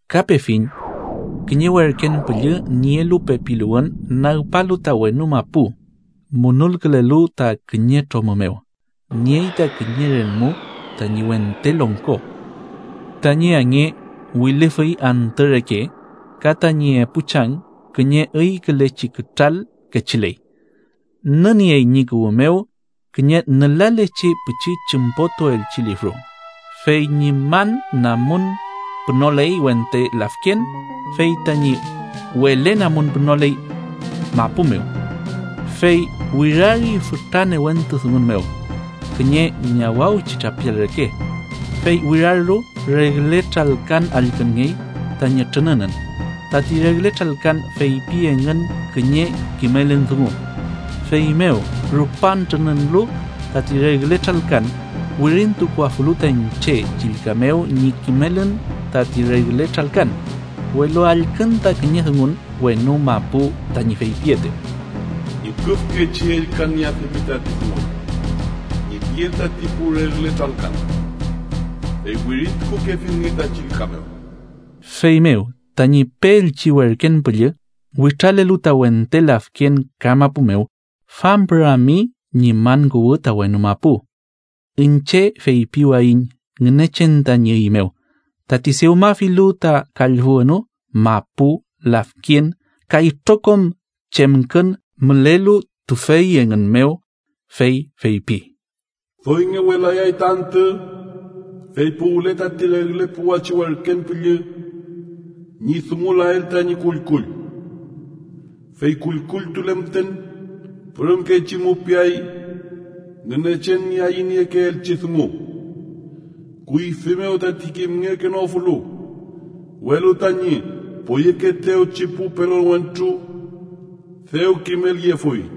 Ka pefiñ kiñe werken püllü nielu pepiluwün, nagpalu ta wenu mapu munulkülelu ta kiñe tromü mew. Niey ta kiñe relmu tañi wente longko, tañi ange wilüfüy antü reke ka tañi epu chang kiñe üykülechi kütral kechiley. Nüniey ñi kuwü mew kiñe nülalechi pichi chümpotuelchi lifru, fey ñi man namun pünoley wente lafken, fey tañi wele namun pünoley mapu mew. Fey wirari fütra newentu dungun mew, kiñe ñawawchi trapial reke. Fey wirarlu, regle tralkan allkünngey tañi trününün. Tati regle tralkan feypi engün kiñe kimelün dungu. Feymew rupan trününülu tati regle tralkan, wirintukuafulu ta iñche chillka mew ñi kimelün tati regle tralkan, welu allkün ta kiñe dungun wenu mapu, tañi feypietew: “Ñüküfkechi ellkanieafimi tati dungun ñi piel tati pu regle tralkan, fey wirintukukefilnge ta chillka mew.” Feymew tañi peelchi werken püllü witralelu ta wente lafken ka mapu mew, fampürami ñi man kuwü ta wenu mapu. Iñche feypiwayiñ Ngünechen tañi üy mew, tati dewmafilu ta kallfü wenu, mapu, lafken ka itrokom chemkün mülelu tüfey engün mew. Fey feypi: “Doy ngewelayay ta antü, fey puwle tati regle puwachi werken püllü ñi dungulael tañi kullkull, fey kullkulltule müten pürümkechi mupiay Ngünechen ñi ayüniekeelchi dungu kuyfi mew tati kimngekenofulu, welu tañi poyekeetewchi pu pelon wentru dew kimelyefuy.”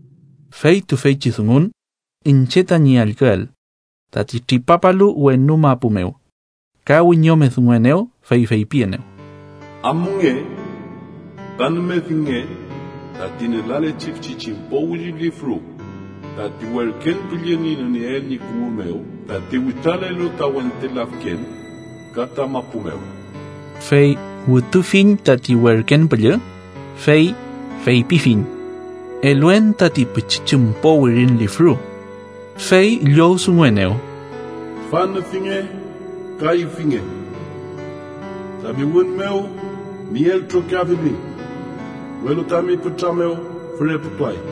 Fey tüfeychi dungun iñche tañi allküel, tati tripapalu wenu mapu mew, ka wiñome dunguenew, fey feypienew: “Amunge ka nümefinge tati nülalechi pichi chümpo wirin lifru tati werken püllü ñi nünieel ñi kuwü mew, tati witralelu ta wente lafken ka ta mapu mew.” Fey wütufiñ tati werken püllü, fey feypifiñ: “Eluen tati pichi chümpo wirin lifru”, fey llowdunguenew: “Tüfa nüfinge ka ifinge. Tami wün mew miel trokiafimi, welu tami pütra mew füreputuay.”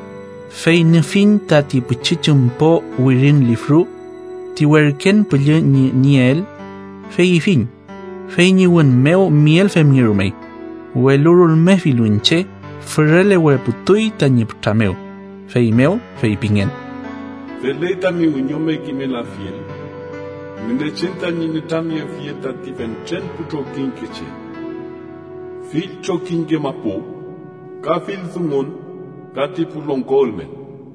Fey nüfiñ tati pichi chümpo wirin lifru ti werken püllü ñi nünieel, fey ifiñ, fey ñi wün mew miel femngerumey, welu rulmefilu iñche, füreleweputuy tañi pütra mew. Feymew feypingen: “Feley tami wiñome kimelafiel Ngünechen tañi nütramyefiel tati fentren pu trokiñkeche, fill trokiñke mapu, ka fill dungun ka ti pu longko ülmen.”